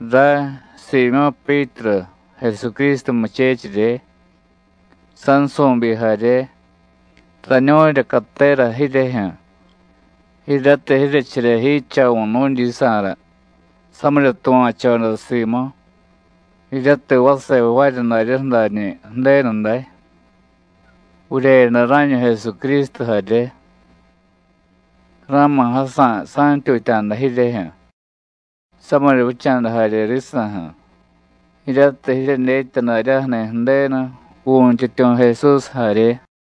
Ray, Siimyó̱ Pyítru, Jesucrístu muchechirye, sansu̱byi jarye, rañu̱rya catera jiryejyu̱ jiryatiy jiryecherye jidchavu̱ nu̱dyisa̱ra samirya tuva̱choda simu, jiryatiy vase jvaarya daryaju̱ dañi̱ Ju̱denu day, vuryeyada rá̱ñu Jesucrístu jarye. Ra̱ma̱ jasa̱y sa̱ntyutya̱da jiryejyu̱, samirya vicha̱da jarye risa̱ju̱, jiryatiy jiryedyetya daryaju̱ni̱ Ju̱denu, Vu̱yntyityu̱ Jesús jarye.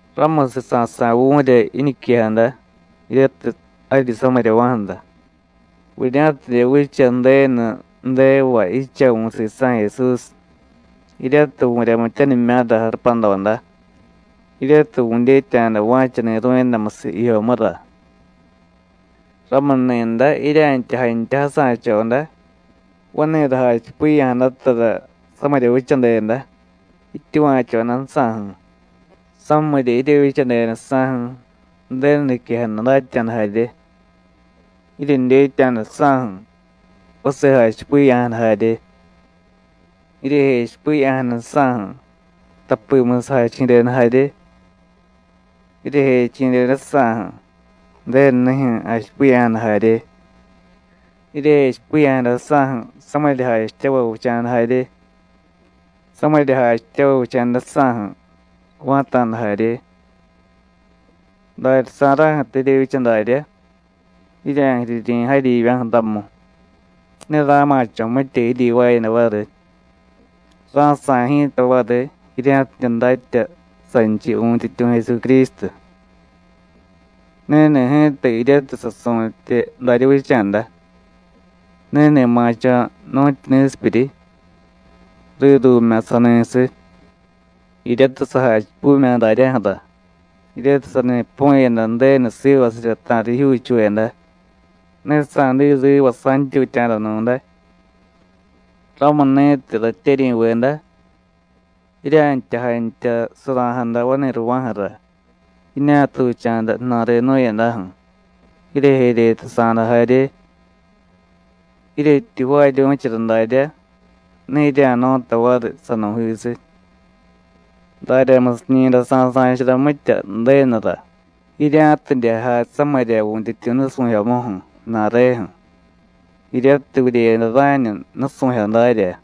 Ramusiy sasa̱y vu̱rya jiñiquejada jiryatiy jaryi samiryava̱ju̱ra, vurya̱tidye vicha Ju̱denu ju̱devay jidchavu̱ sisa̱ Jesús, jiryatiy vu̱ryamityanimya̱ra jarupadoda, jiryatiy vu̱dyetya̱da va̱cha ni̱ru̱yadamusiy jijyomura. Ramuni̱day jirya̱ntya jantya jasa̱choda vani̱ra jachipiya̱jadatara samirya vichadeda, jityuva̱chodajsa̱ju̱; samirya jiryevyichadedajsa̱ju̱, Ju̱denu niquejada datya̱da jarye; jiryedyetya̱dajsa̱ju̱, vase jachipiya̱jada jarye; jiryejechipiya̱jadajsa̱ju̱, tapimusiy jachi̱deda jarye; jiryejechi̱dedajsa̱ju̱, Ju̱denunijyu̱ jachipiya̱jada jarye; jiryejechipiya̱jadajsa̱ju̱, samirya jachityavay vicha̱da jarye; samirya jachityavay vicha̱dajsa̱ju̱, va̱ta̱da jarye. Daryasa̱ra̱ju̱tiy jiryevyicha darya, jirya̱jiriryi̱ jaryivya̱ju̱ ramu, ne ra̱ma̱cho̱ mitya jiryivaayada variy, ra̱sa̱y ji̱ta variy, jirya̱tidye datya sanchiy Vu̱yntyityu̱ Jesucrístu. Ni̱ni̱ ji̱ta jiryatiy sasu̱tye darya vicha̱da, ni̱ni̱ ma̱cho̱ nu̱tyu ni̱sipyuryi, rírumya̱ sani̱siy, jiryatiy sajachipumya̱ daryaju̱ra jiryatiy sani pu̱yada Ju̱denu sivasirya ta̱riy jijyuuchuveda, (ne sa̱diy riva sa̱ntyutya̱da nu̱day). Ramuni̱tiy, ratyeryi̱veda, jirya̱ntya jantya sura̱jada vani̱rava̱ju̱ra jiñatucha̱da ju̱na̱re jnu̱yadaju̱, jiryejeryetasa̱da jarye. Jiryetyi jvaaryu̱chara darya, ne jirya̱no̱tay variy sanu̱jisiy. Daryamusiñi̱day sa̱sa̱chara mitya Ju̱denura jirya̱tidye jay samirya Vu̱yntyityu̱ nusu̱jyomuju̱, ju̱na̱reju̱, jiryatiy vuryeyada rá̱ñu nusu̱jyo darya.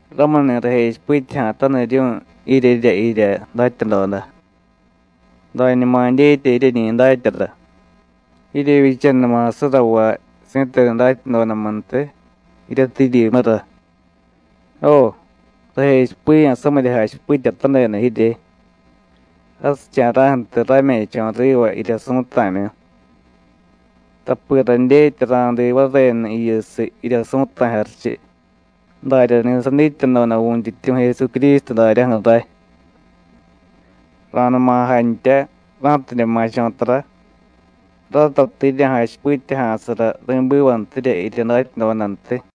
Ramuni̱ rajechipityaja̱taniryu̱y jiryerya jirya datyadoda, dañuma dyetya jiryeñi datyara, jiryevyichanuma surravay si̱tenu datyadodamuntiy jiryatiy jiryimura. Jo, rajechipiya̱ samirya jachipityatadeda jirye jasicha̱ra̱ju̱tiy rame̱cho̱ riva jirya su̱ta̱myu, tapi radyetya ra̱diiy varenu jiyusiy, jirya su̱ta̱y jarichiy, daryani̱ sadityadoda Vu̱yntyityu̱ Jesucrístu daryaju̱ ray. Ra̱numa jantya ra̱tidye ma̱cho̱ tara, ratatiy jirya̱jachipityaja̱sara ri̱bivantirya jirya datyadodantiy.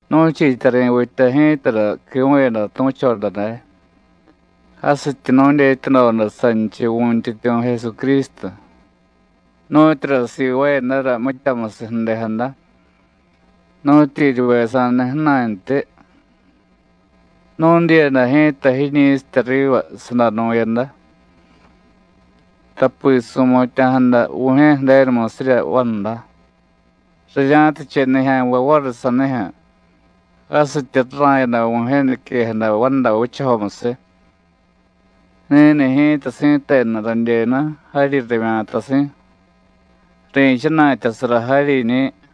Nu̱chiityari̱vitya ji̱tara quivu̱yada tu̱choda day jasityi nu̱dyetyadoda sanchiy Vu̱yntyityu̱ Jesucrístu, nu̱tyura sivaayadara mityamusiy ju̱dejada, nu̱tyeryivye sa̱jniy ju̱na̱ntyi. Nu̱dyiyada ji̱ta jiñi̱sitya riva sadanu̱yada. Tapi su̱mutya̱jada Vu̱jye̱ Ju̱denumusirya vanda, rirya̱tiche nijya̱nvay variy sanijyu̱ jasityi rara̱yada Vu̱jye̱ niquejada vanda vichajomusiy: “Ni̱ni̱ ji̱ta si̱tenu radyenu jaryi ravya̱tasi̱; ri̱chana̱tyasara jaryiñi̱.”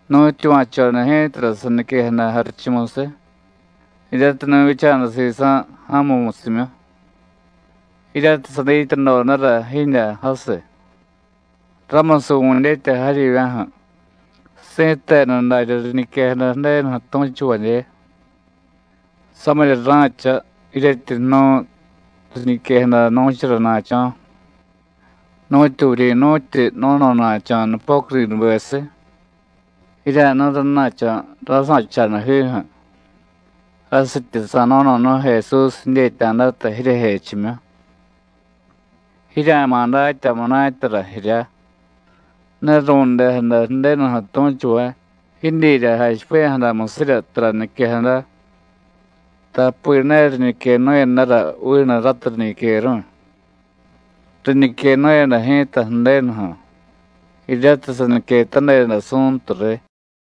Nu̱tyuva̱choda ji̱tara saniquejada jarichumusiy jiryatiy nu̱vyicha̱da sisa̱ ja̱mumusimyu, jiryatiy sadityadodara jidyá jasiy. Ramusiy vu̱dyetya jaryivya̱ju̱, si̱tenu daryá riñiquejada Ju̱denuju̱ tu̱chuvadye. Samirya ra̱cha jiryetyi jnu̱y riñiquejada nu̱charana̱cho̱, nu̱tyu vuryi̱nu̱tyi no̱no̱na̱cho̱ nupocudinubesiy. Jirya̱jnu̱y rana̱cho̱ ra̱sa̱chadajiju̱ jasityi sa̱no̱no̱nu̱y Jesús jidyetya̱data jiryejechimyu. Jirya̱ma̱ datya munatyara jirya; ne ru̱ndejada Ju̱denuju̱ tu̱chuvay jidyirya jachipiya̱jadamusirya tara niquejada, tapi ne riñiquenu̱yadara vinu ratiy riñiqueru̱y. Riñiquenu̱yada ji̱ta Ju̱denuju̱, jiryatiy saniquetadeda Su̱ntu riy.